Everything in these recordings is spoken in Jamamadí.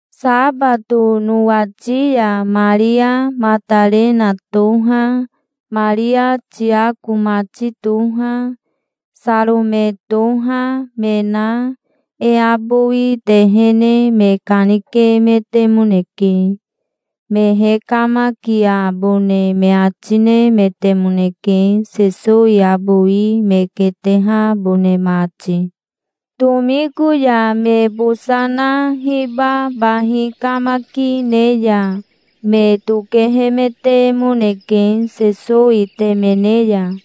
Sabato nowati ya Maria Matarena toha, Maria Tiako mati toha, Sarome toha, me na e abowi tehene me kanikemetemoneke. Me hekamakiabone me ati nemetemoneke, Sesowi abowi me ketehabone mati. Tomiko ya me bosa na hiba bahi kamaki ne ya me tokehemetemoneke Sesowi temene ya.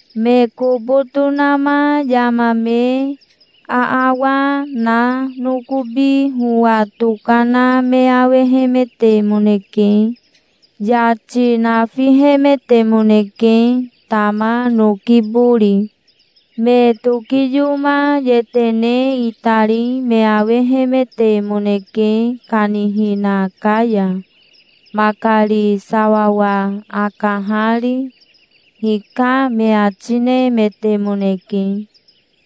Me kobo tonama yama me aawa na nokobi howa tokana me awehemetemoneke. Yati nafihemetemoneke, tama noki bori. Me tokiyoma yetene itari me awehemetemoneke, kanihina ka ya, makari sawawa akahari. "Hika", me ati nemetemoneke.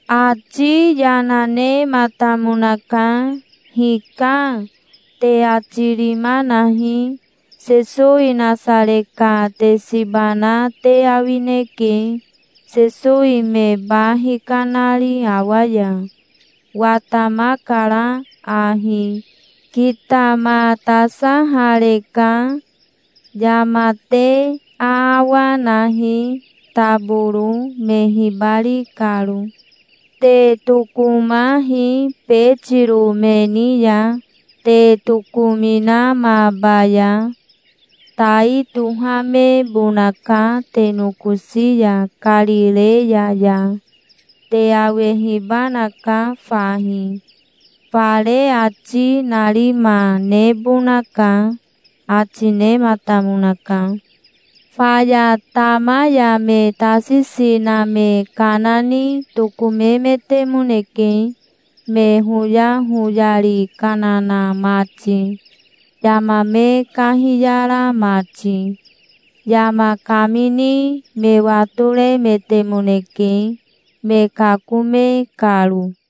Ati yana nematamonaka. "'Hika', te ati rima nahi. Sesowi Nasare ka te siba na te awineke, Sesowi me ba hikanari awa ya. Watamakara ahi. Kitamatasahareka. Yama te aawa nahi, taboro, me hibari karo. Te tokomahi Betiro me ni ya, te tokominamabaya. Tai tohamebonaka te nokosi ya Karireya ya. Te awehibanaka fahi. Fare ati narima nebonaka", ati nematamonaka. Faya tama ya me tasisi na me kana ni tokomemetemoneke, me hoyahoyari kana na mati, yama me kahiyara mati. Yama kamini me watoremetemoneke, me kakome karo.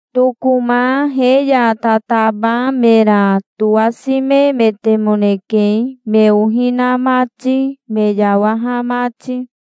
Tokoma he ya tataba mera towasimemetemoneke, me ohi na mati, me yawaha mati.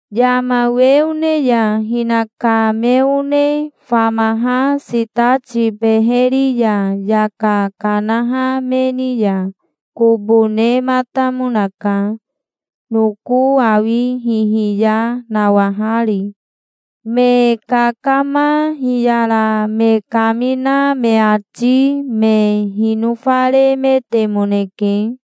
Yama we one ya hinaka me one famaha sitati beheri ya yaka kanaha me ni ya kobo nematamonaka, noko awi hihiya nawahari. Me kakama hiyara me kamina me ati me hinofaremetemoneke.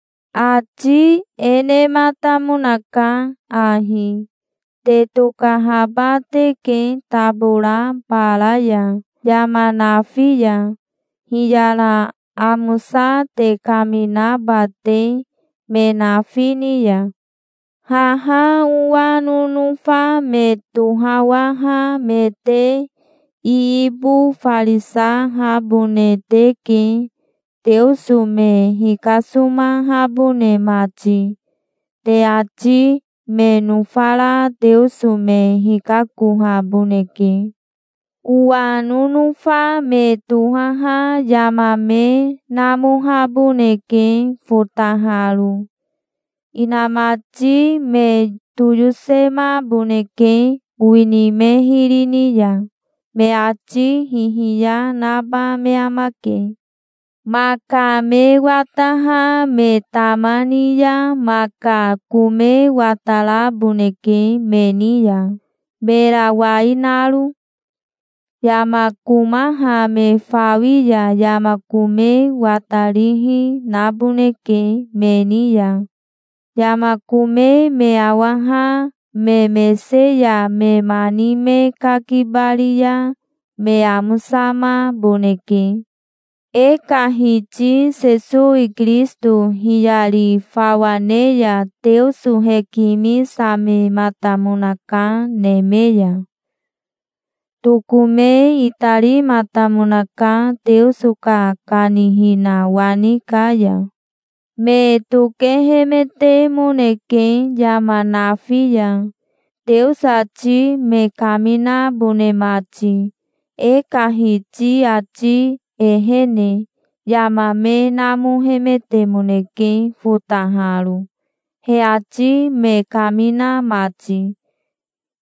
Ati e nematamonaka ahi: "Te tokahaba teke tabora bara ya yama nafi ya, hiyara amosa te kaminaba te, me nafi ni ya. Haha owa nonofa me tohawaha me te iibofarisahabone teke, Teoso me hikasomahabone mati. Te ati me nofara Teoso me hikakohaboneke. Owa nonofa me tohaha yama me namohaboneke fotaharo. Inamati me toyosemaboneke, owini me hiri ni ya. Me ati hihiya naba me amake. Maka me wataha me tama ni ya, maka kome wataraboneke me ni ya, mera wai naro. Yama komaha me fawi ya yama kome watarihi naboneke me ni ya. Yama kome me awaha me mese ya me mani me kakibari ya me amosamaboneke". E ka Hiti Sesowi Kirisito hiyari fawa ne ya Teoso hekimisamematamonaka neme ya. Tokome itarimatamonaka Teoso ka kanihina wani ka ya. Me tokehemetemoneke yama nafi ya, Teoso ati me kaminabone mati. E ka Hiti ati ehene yama me namohemetemoneke fotaharo, he ati me kamina mati.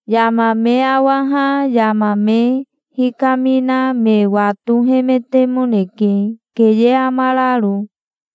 Yama me awaha yama me hikamina me watohemetemoneke, keye amararo.